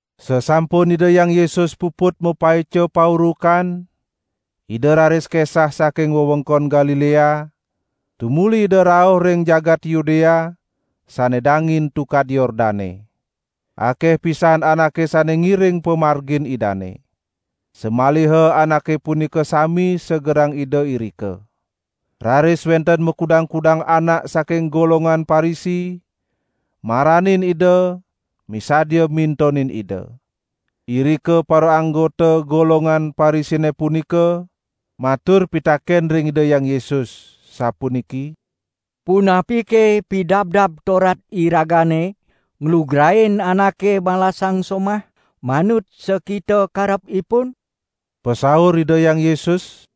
Sasampun Ida Hyang Yesus puput mapaica paurukan, ida raris kesah saking wewengkon Galilea, tumuli Ida rauh ring jagat Yudea sane dangin Tukad Yordane. Akeh pisan anake sane ngiring pamargin Idane. Samaliha anake punika sami segerang Ida irika. Raris wenten makudang-kudang anak saking golongan Parisi maranin Ida misadia mintonin Ida. Irika paraanggota golongan Parisine punika matur pitaken ring Ida Hyang Yesus, sapuniki: "Punapike Pidabdab Torat iragane nglugrain anake malasang somah manut sakita karep ipun?" Pasaur Ida Hyang Yesus: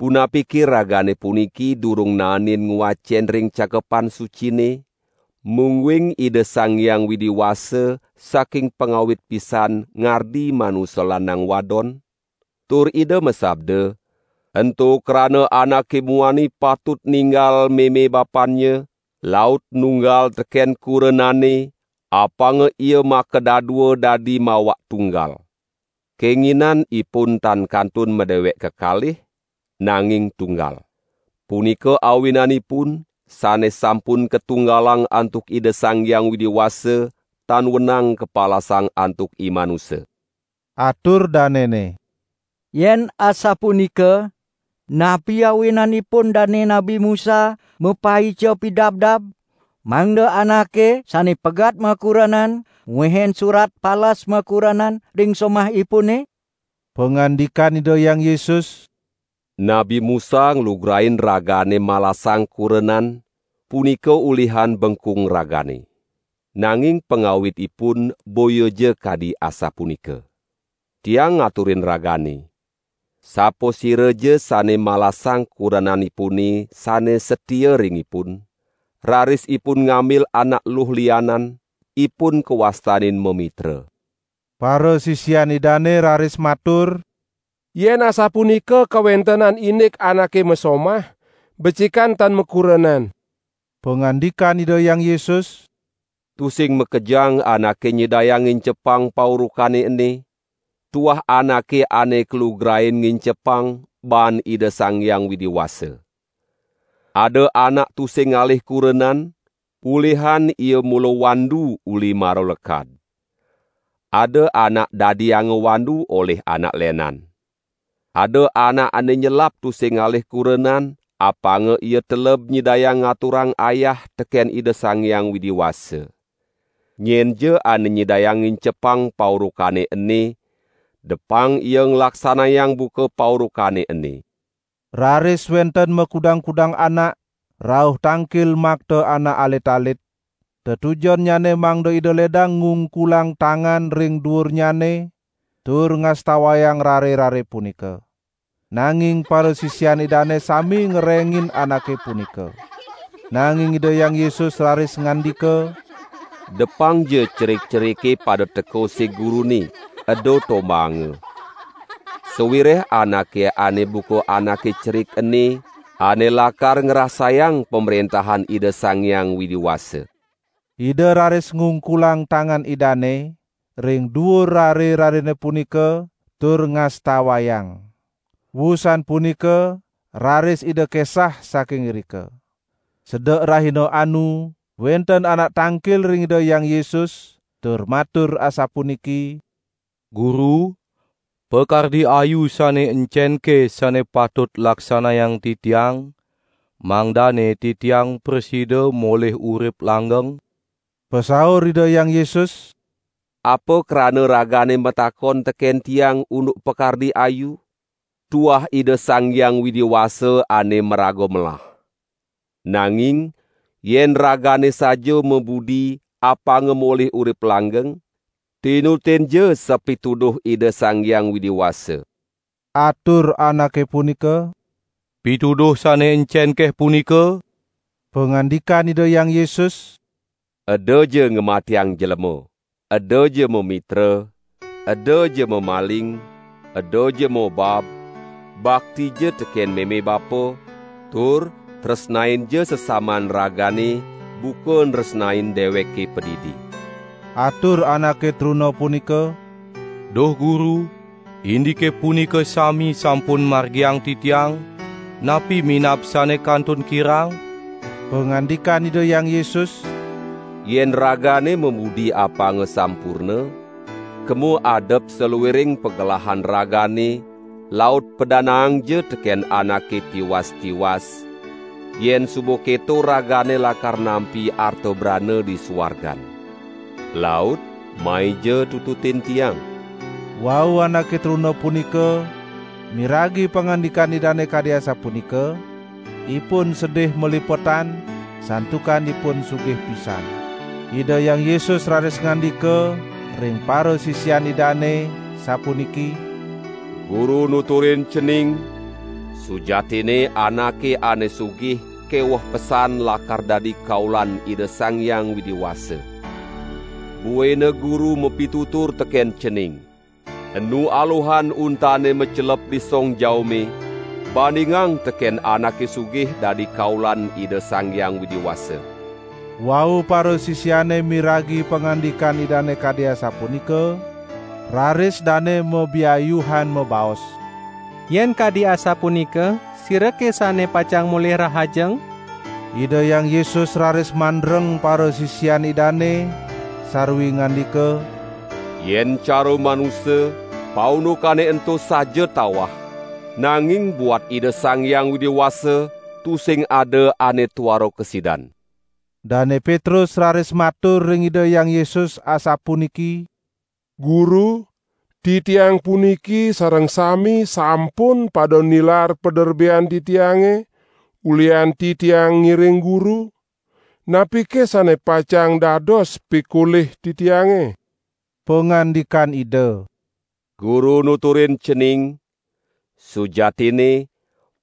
"Punapike ragane puniki durung naenin ngwacen ring Cakepan Sucine, mungguing Ida Sang Hyang Widi Wasa saking pangawit pisan ngardi manusa lanang wadon? Tur Ida masabda: 'Ento krana anake muani patut ninggal meme bapannya, laut nunggal teken kurenanne, apanga ia makadadua dadi mawak tunggal.' Kenginan ipun tan kantun madewek kekalih, nanging tunggal. Punika awinanipun, sane sampun katunggalang antuk Ida Sang Hyang Widi Wasa tan wenang kapalasang antuk imanusa." Atur danene: "Yen asapunika, napi awinanipun Dane Nabi Musa mapaica pidabdab, mangda anake sane pegat makurenan ngwehin surat palas makurenan ring somahipune?" Pangandikan Ida Hyang Yesus: "Nabi Musa nglugrain ragane malasang kurenan, punika ulihan bengkung ragane. Nanging pangawitipun boyaja kadi asapunika. Tiang ngaturin ragane: Sapasiraja sane malasang kurenanipune sane satia ring ipun, raris ipun ngambil anak eluh lianan, ipun kawastanin mamitra." Parasisian Idane raris matur: "Yen asapunika kawentenan indik anake masomah, becikan tan makurenan." Pangandikan Ida Hyang Yesus: "Tusing makejang anake nyidayang ngincepang paurukane ene, tuah anake ane kalugrain ngincepang baan Ida Sang Hyang Widi Wasa. Ada anak tusing ngalih kurenan, ulihan ia mula wandu uli mara lekad. Ada anak dadianga wandu olih anak lenan. Ada anak ane nyelap tusing ngalih kurenan apanga ia teleb nyidayang ngaturang ayah teken Ida Sang Hyang Widi Wasa. Nyenja ane nyidayang ngincepang paurukane ene, depang ia nglaksanayang buka paurukane ene." Raris wenten makudang-kudang anak rauh tangkil makta anak alit-alit, tetujonnyane mangda Ida ledang ngungkulang tangan ring duurnyane tur ngastawayang rare-rare punika. Nanging parasisian Idane sami ngerengin anake punika. Nanging Ida Hyang Yesus raris ngandika: "Depangja cerik-cerike pada teka sig Gurune, eda tombaanga. Sawireh anake ane buka anake cerik ene ane lakar ngrasayang Pamrentahan Ida Sang Hyang Widi Wasa." Ida raris ngungkulang tangan Idane ring duur rare-rarene punika tur ngastawayang. Wusan punika raris Ida kesah saking irika. Sedek rahina anu, wenten anak tangkil ring Ida Hyang Yesus tur matur asapuniki: "Guru, pakardi ayu sane encenke sane patut laksanayang titiang, mangdane titiang prasida molih urip langgeng?" Pasaur Ida Hyang Yesus: "Apa krana ragane matakon teken Tiang unduk pakardi ayu? Tuah Ida Sang Hyang Widi Wasa ane maraga melah! Nanging yen ragane saja mabudi apanga molih urip langgeng, tinutinja sapituduh Ida Sang Hyang Widi Wasa." Atur anake punika: "Pituduh sane encenke punika?" Pangandikan Ida Hyang Yesus: "Edaja ngamatiang jlema, edaja mamitra, edaja mamaling, edaja mobab, baktija teken meme bapa, tur tresnainja sesaman ragane buka nresnain deweke padidi." Atur anake truna punika: "Duh Guru, indike punika sami sampun margiang titiang, napi minab sane kantun kirang?" Pangandikan Ida Hyang Yesus: "Yen ragane mabudi apanga sampurna, kema adep saluiring pagelahan ragane laut padanaangja teken anake tiwas-tiwas, yen suba keto ragane lakar nampi arta brana di suargan. Laut maija tututin Tiang." Wau anake truna punika miragi pangandikan Idane kadi asapunika, ipun sedih malipetan, santukan ipun sugih pisan. Ida Hyang Yesus raris ngandika ring parasisian Idane sapuniki: "Guru nuturin cening, sujatinne anake ane sugih keweh pesan lakar dadi kaulan Ida Sang Hyang Widi Wasa. Buina Guru mapitutur teken cening: Enu aluhan untane macelep di song jaume, bandingang teken anake sugih dadi kaulan Ida Sang Hyang Widi Wasa." Wau parasisiane miragi pangandikan Idane kadi asapunika, raris dane mabiayuhan mabaos: "Yen kadi asapunika, sirake sane pacang molih rahajeng?" Ida Hyang Yesus raris mandreng parasisian Idane sarwi ngandika: "Yen cara manusa, paundukane ento saja tawah, nanging buat Ida Sang Hyang Widi Wasa tusing ada ane tuara kasidan." Dane Petrus raris matur ring Ida Hyang Yesus asapuniki: "Guru, titiang puniki sareng sami sampun pada nilar paderbean titiange ulihan titiang ngiring Guru, napike sane pacang dados pikolih titiange?" Pangandikan Ida: "Guru nuturin cening, sujatinne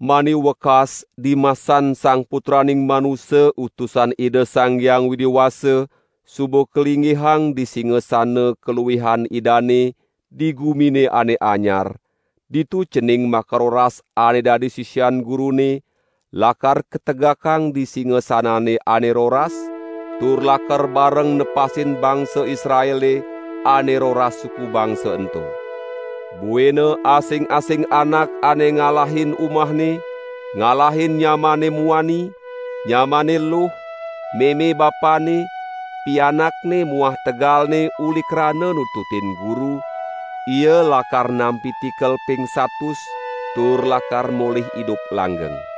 mani wekas dimasan Sang Putraning Manusa Utusan Ida Sang Hyang Widi Wasa suba kalinggihang di singasana kaluihan Idane di Gumine Ane Anyar ditu cening makaroras ane dadi sisian Gurune, lakar kategakang di singasanane ane roras, tur lakar bareng nepasin bangsa Israele ane roras suku bangsa ento. Buina asing-asing anak ane ngalahin umahne, ngalahin nyamanne muani, nyamanne eluh, meme bapanne, pianakne muah tegalne uli krana nututin Guru, ia lakar nampi tikel ping satus, tur lakar molih idup langgeng.